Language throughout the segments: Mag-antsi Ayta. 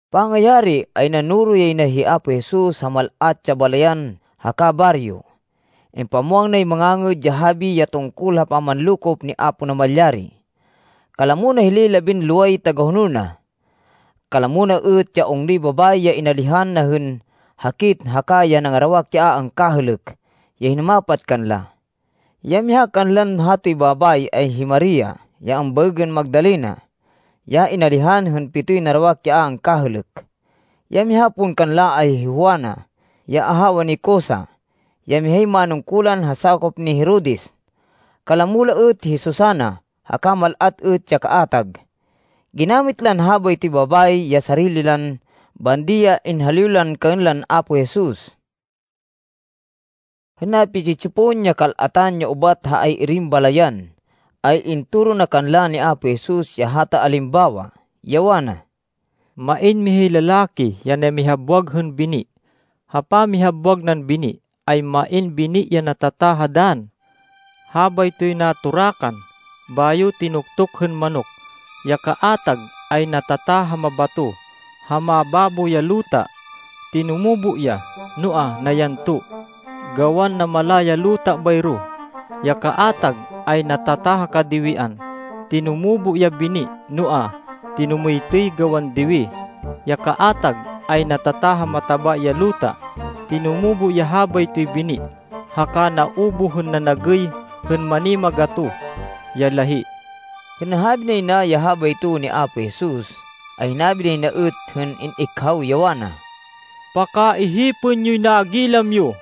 Pangayari, ay nanoro yay na hi Apo Jesus ha mal-at ya balayan haka baryo. Impamwang nay Mangangêd ya Habi ya tungkol ha pamanlokop ni Apo Namalyari. Kalamo na hilay labinloway tagahonol na. Kalamo na êt ya ungnoy babayi ya inalihan na hên hakit haka ya nangarawak ya a angkahêlêk ya hinumapat kanla. Ya miha kanlan hatoy babayi ay hi Maria, ya ambaêgên Magdalena, ya inalihan hên pitoy narawak ya a angkahêlêk. Ya miha pon kanla ay hi Juana ya ahawa ni Cusa, ya mihay manungkulan ha sakop ni Herodes. Kalamo la êt hi Susana haka mal-at êt ya kaatag. Ginamit lan habaytoy babayi ya sarili lan bandi ya inhaliw lan kaên lan Apo Jesus. Hên napi-tsi-tsipon ya kal-atan ya ubat ha ay-irin balayan, ay intoro na kanla ni Apo Jesus ya hata alimbawa, ya wana, “Main mihay lalaki ya namihabwag hên bini. Ha pamihabwag nan bini ay main bini ya natata ha dann. Habaytoy natorakan bayo tinuktuk hên manok. Ya kaatag ay natata ha mabato ha mababo ya luta. Tinumubo ya, noa, nayanto, gawan namala ya luta bayro. Ya kaatag ay natata ha kadiwian. Tinumubo ya bini, noa, tinumêytêy, gawan diwi. Ya kaatag ay natata ha mataba ya luta. Tinumubo ya habaytoy bini haka naubuh hên nanagêy hên manimagatoh ya lahí.” Hên nahabi nay na ya habayto ni Apo Jesus ay hinabi nay na êt hên in-ikhaw, ya wana, “Pakaihipên yoy nagilam yo!”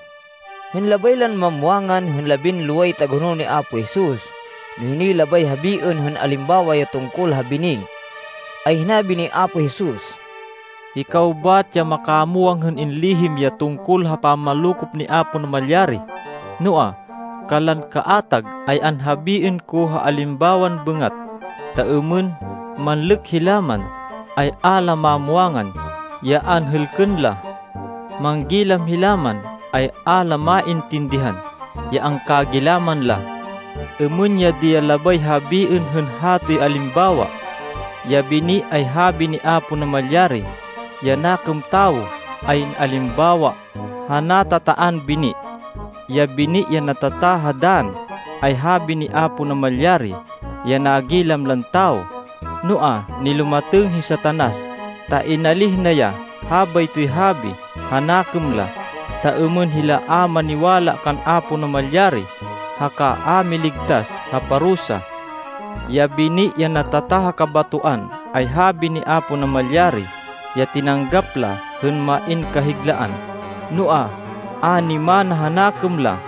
Hên labay lan mamwangan hên labinloway tagahonol ni Apo Jesus no hinoy labay habiên hên alimbawa ya tungkol ha bini, ay hinabi ni Apo Jesus, “Hikaw bat ya makamwang hên inlihim ya tungkol ha pamanlokop ni Apo Namalyari, noa, kanlan kaatag ay anhabiên ko ha alimbawan bêngat, ta êmên ‘Manlêk hila man, ay a la mamwangan ya anhêlkên la. Manggilam hila man, ay a la maintindihan ya angkagilaman la.’” “Êmên ya di ya labay habiên hên hatoy alimbawa. Ya bini ay habi ni Apo Namalyari. Ya nakêm tawo ay in-alimbawa ha natataan bini. Ya bini ya natata ha dann ay habi ni Apo Namalyari ya nagilam lan tawo, noa, nilumatêng hi Satanas ta inalíh na ya habaytoy habi ha nakêm la, ta êmên hila a maniwala kan Apo Namalyari, haka a miligtas ha parusa. Ya bini ya natata ha kabatoan, ay habi ni Apo Namalyari ya tinanggap la hên main kahiglaan, noa, a nimana ha nakêm la.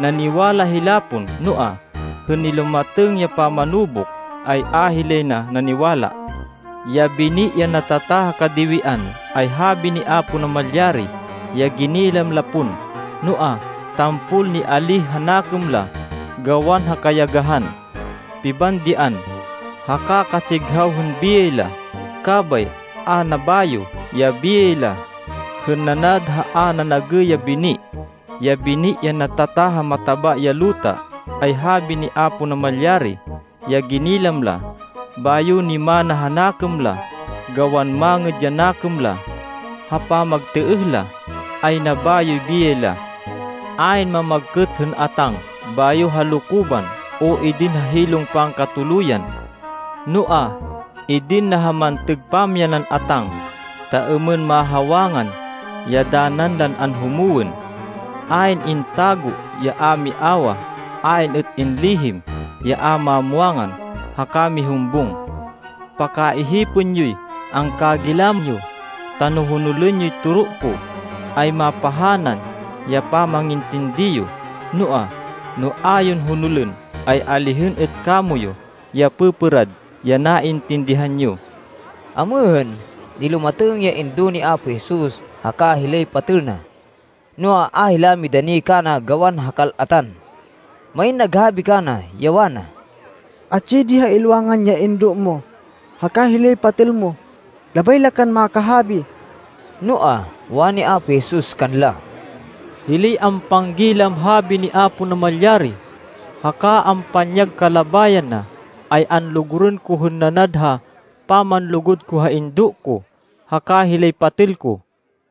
Naniwala hila pon, noa, hên nilumatêng ya pamanubuk, ay a hilay na naniwala. Ya bini ya natata ha kadiwian ay habi ni Apo Namalyari ya ginilam la pon, noa, tampol nialíh ha nakêm la, gawan ha kayagahan, pibandian, haka katsighaw hên biyay la. Kabay a nabayo ya biyay la, hên nanad ha a nanagêy ya bini. Ya bini ya natata ha mataba ya luta ay habi ni Apo Namalyari ya ginilam la, bayo nimana ha nakêm la, gawan mangêd ya nakêm la. Ha pamagtêêh la, ay nabayoy biyay la.” “Ayn mamagkêt hên atáng bayo halokoban o idin ha hilong pangkatuluyan. Noa, idin na ha mantêg pamyanan atáng, ta êmên mahawangan ya danan lan anhumwên. Ayn intago ya a miawah. Ayn êt inlihim ya a mamwangan haka mihumbung. “Pakaihipên yoy angkagilam yo, ta no honolên yoy toro ko, ay mapahanan ya pamangintindi yo, noa, no a yon honolên, ay alihên êt kamoyu ya pêpêrad ya naintindihan yo.” Amêhên, nilumatêng ya indo ni Apo Jesus haka hilay patêl na, noa, a hila midani kana gawan ha kal-atan. Main naghabi kana, ya wana, “Atsi di ha ilwangan ya indo mo haka hilay patêl mo. Labay la kan makahabi.” Noa, wani ni Apo Jesus kanla, “Hilay ampanggilam habi ni Apo Namalyari haka ampanyag kalabayan na, ay anlugurên ko hên nanad ha pamanlugud ko ha indo ko, haka hilay patêl ko.”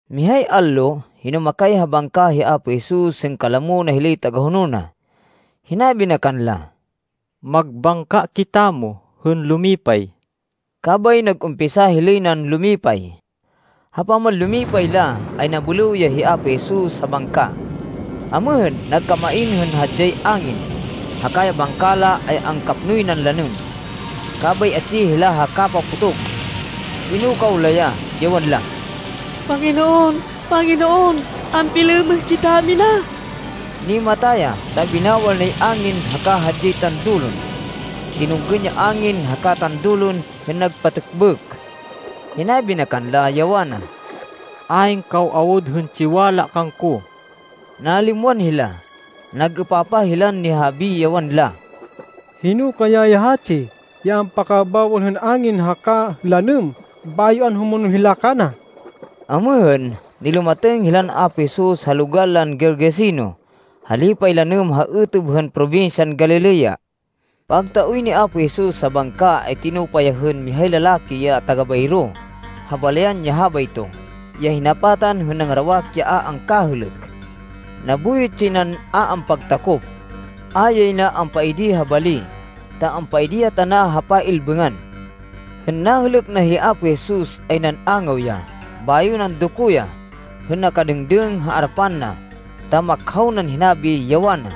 Mihay allo, hinumakay ha bangka hi Apo Jesus hên kalamo na hilay tagahonol na. Hinabi na kanla, “Magbangka kitamo hên lumipay.” Kabay nag-umpisa hilay nan lumipay. Ha pamanlumipay la, ay nabêlêw ya hi Apo Jesus ha bangka. Amêhên, nagkamain hên hadyay angin, haka ya bangka la ay angkapnoy nan lanêm, kabay atsi hila ha kapapotog. Pinukaw la ya, ya wanla, “Panginoon! Panginoon! Ampilêmêh kitamina!” Nimata ya, ta binawal nay angin haka hadyay tandulon. Tinunggên ya angin haka tandulon, hên nagpatêkbêk. Hinabi na kanla, ya wana, “Ayn kaw awud hên tsiwala kangko!” Nalimwan hila. Nag-êpapah hilan nihahabi, ya wanla, “Hino kaya ya hatsi ya ampakabawal hên angin haka lanêm, bayo anhumonol hila kana?” Amêhên, nilumatêng hilan Apo Jesus ha logal lan Gergeseno ha lipay lanêm ha êtêb hên probinsyan Galilea. Pagtaoy ni Apo Jesus ha bangka ay tinupa ya hên mihay lalaki ya taga bayro ha balayan ya habayto ya hinapatan hên nangarawak ya a angkahêlêk. Nabuyot yay nan, a ampagtakop. A yay na ampaidi ha bali, ta ampaidi ya tana ha pay-ilbêngan. Hên nahêlêk na hi Apo Jesus, ay nan-angaw ya, bayo nandoko ya, hên nakadêngdêng ha arapan na, ta makhaw nan hinabi, ya wana,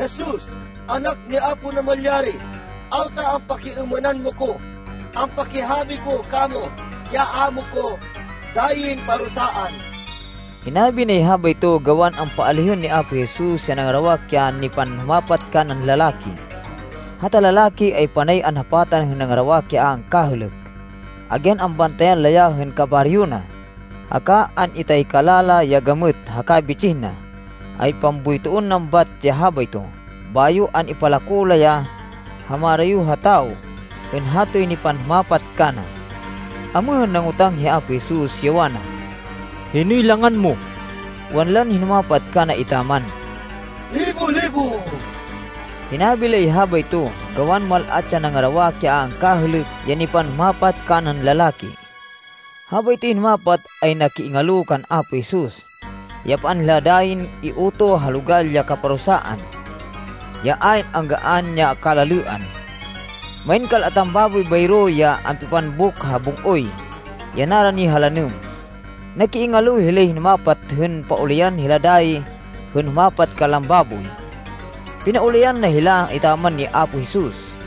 “Jesus, Anak ni Apo Namalyari, awta ampakiêmênan mo ko? Ampakihabi ko kamo ya a mo ko dayin parusaan.” Hinabi nay habayto gawan ampaalihên ni Apo Jesus ya nangarawak ya nipanhumapat kanan lalaki. Hata lalaki ay panay anhapatan hên nangarawak ya a angkahêlêk. Agyan ambantayan la ya hên kabaryo na, haka an-itaykala la ya gamêt haka bitsih na, ay pamboytoên nan bat ya habayto, bayo an-ipalako la ya ha marayo ha tawo hên hatoy nipanhumapat kana. Amêhên, nangotang hi Apo Jesus, ya wana, “Hinoy langan mo?” Wanlan hinumapat kana etaman, “Libo-Libo.” Hinabi lay habayto, gawan mal-at ya nangarawak ya a angkahêlêk ya nipanhumapat kanan lalaki. Habaytoy hinumapat ay nakiingalo kan Apo Jesus, ya paan hila dayin iutoh ha logal ya kaparusaan, ya ayn anggaan ya kalalêan. Main kal-atan baboy bayro ya ampipambuk ha bung-oy ya narani ha lanêm. Nakiingalo hilay hinumapat hên paulayan hila dayi hên humapat kanlan baboy. Pinaulayan na hila etaman ni Apo Jesus.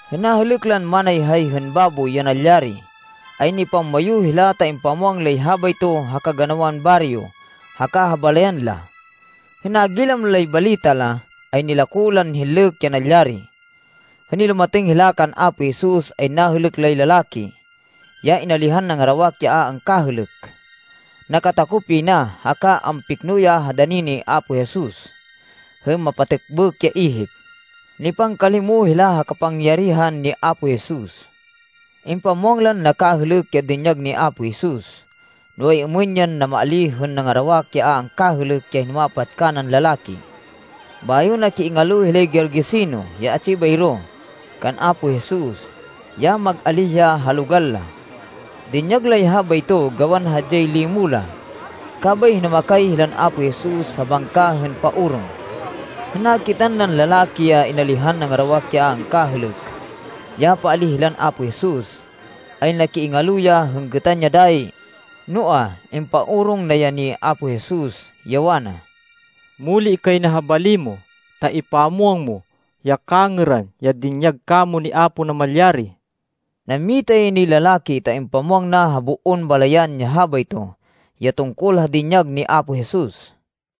Hên nahêlêk lan manayhay hên baboy ya nalyari, ay nipamwayu hila ta impamwang lay habayto ha kaganawan baryo haka ha balayan la. Hên nagilam lay balita la, ay nilako lan hinlêk ya nalyari. Hên nilumatêng hila kan Apo Jesus ay nahêlêk lay lalaki, ya inalihan nangarawak ya a angkahêlêk. Nakatakop yay na haka ampikno ya ha dani ni Apo Jesus hên mapatêkbêk ya ihip. Nipangkalimo hila ha kapangyarihan ni Apo Jesus. Impamwang lan nakahêlêk ya dinyag ni Apo Jesus, no ay-êmên yan namaalíh hên nangarawak ya a angkahêlêk ya hinumapat kanan lalaki. Bayo nakiingalo hilay Gergeseno ya atsi bayro, kan Apo Jesus, ya mag-alíh ya ha logal la. Dinyag lay habayto gawan hadyay limo la. Kabay hinumakay hilan Apo Jesus ha bangka hên paorong. Hên nakitan nan lalaki ya inalihan nangarawak ya a angkahêlêk, ya paalíh hilan Apo Jesus, ay nakiingalo ya hên gêtan ya dayi, noa, impaorong na ya ni Apo Jesus, ya wana, “Muli kay na ha bali mo, ta ipamwang mo ya kangêran ya dinyag kamo ni Apo Namalyari.” Nammita yay nay lalaki ta impamwang na ha boon balayan ya habayto ya tungkol ha dinyag ni Apo Jesus.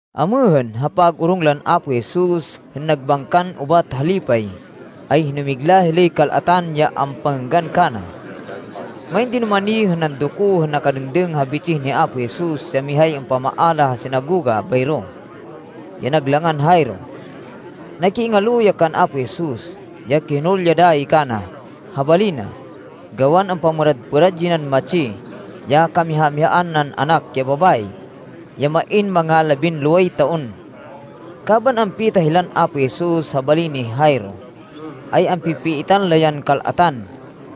Amêhên, ha pag-orong lan Apo Jesus hên nagbangkan ubat ha lipay, ay hinumigla hilay kal-atan ya ampangênggan kana. Main dinumani hên nandoko hên nakadêngdêng ha bitsih ni Apo Jesus ya mihay ampamaala ha sinagoga bayro, ya nag langan Jairo. Nakiingalo ya kan Apo Jesus, ya kihonol ya dayi kana ha bali na, gawan ampamêrad-pêrad yay nan matsi, ya kamiha-mihaan nan anak ya babayi, ya main manga labinloway taon. Kaban ampita hilan Apo Jesus ha bali ni Jairo, ay ampi-pipiitan la yan kal-atan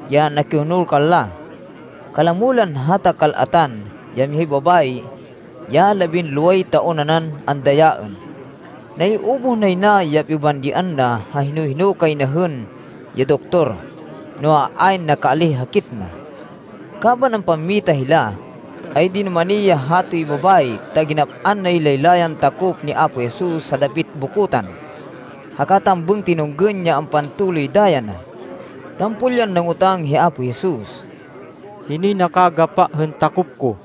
ya nakihonol kanla. Kalamo lan hata kal-atan, ya mihay babayi, ya labinloway taon nanan andayaên. [Naiubuh nay na ya pibandian na ha hino-hino kay na hên ya doktor, noa, ayn nakaalíh hakit na.] Kaban ampammita hila, ay dinumani ya hatoy babayi ta ginap-an nay laylayan takop ni Apo Jesus ha dapit bokotan, haka tambêng tinunggên ya ampantoloy daya na. Tampol yan nangotang hi Apo Jesus, “Hinoy nakagapa hên takop ko?”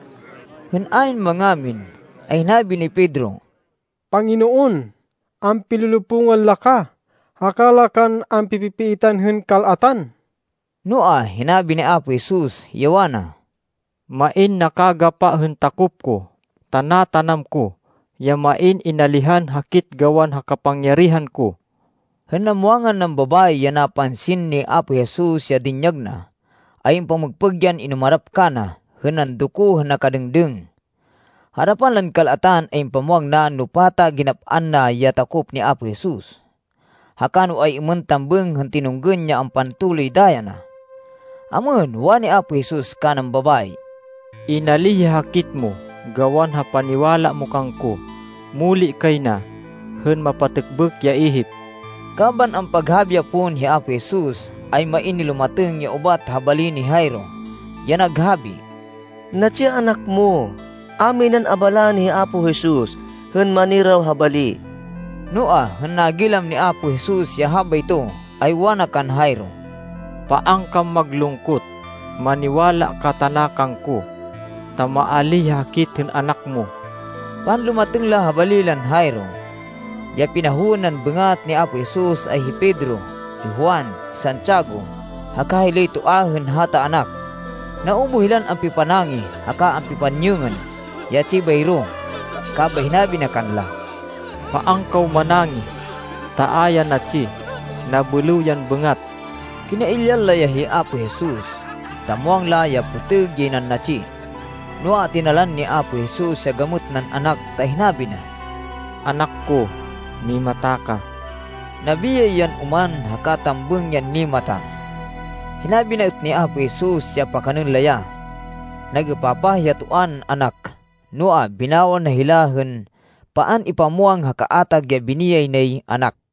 Hên ayn mangamin, ay hinabi ni Pedro, “Panginoon, ampilolopungan la ka, haka la kan ampi-pipiitan hên kal-atan!” Noa, hinabi ni Apo Jesus, ya wana, “Main nakagapa hên takop ko, ta natanam ko ya main inalihan hakit gawan ha kapangyarihan ko.” Hên namwangan nan babayi ya napansin ni Apo Jesus ya dinyag na, ay ampamêgpêg yan inumarap kana, hên nandoko hên nakadêngdêng. Ha arapan lan kal-atan, ay impamwang na no pata ginap-an na ya takop ni Apo Jesus, haka no ay-êmên tambêng hên tinunggên ya ampantoloy daya na. Amêhên, wani Apo Jesus kanan babayi, “Inalíh ya hakit mo gawan ha paniwala mo kangko. Muli kay na hên mapatêkbêk ya ihip.” Kaban ampaghabi ya pon hi Apo Jesus, ay main nilumatêng ya ubat ha bali ni Jairo, ya naghabi, “Natsi ya anak mo. A minan abalaên hi Apo Jesus hên maniraw ha bali.” Noa, hên nagilam ni Apo Jesus ya habayto, ay wana kan Jairo, “Paan kan maglungkot. Maniwala ka tana kangko, ta ma-alíh ya hakit hên anak mo.” Panlumatêng la ha bali lan Jairo, ya pinahowên nan bêngat ni Apo Jesus ay hi Pedro, hi Juan, hi Santiago haka hilay toa hên hata anak. Naubuh hilan ampipanangih haka ampipanyêngên ya atsi bayro, kabay hinabi na kanla, “Paan kaw manangih ta a ya natsi. Nabêlêw yan bêngat.” Kinailyan la ya hi Apo Jesus, ta muwang la ya pêtêg yay nan natsi. Noa, tinalan ni Apo Jesus ya gamêt nan anak ta hinabi na, “Anak ko, mimata ka.” Nabiyay yan oman haka tambêng yan nimata. Hinabi na êt ni Apo Jesus ya pakanên la ya. Nag-êpapah ya toa nan anak, noa, binawal na hila hên paan ipamwang ha kaatag ya biniyay nay anak.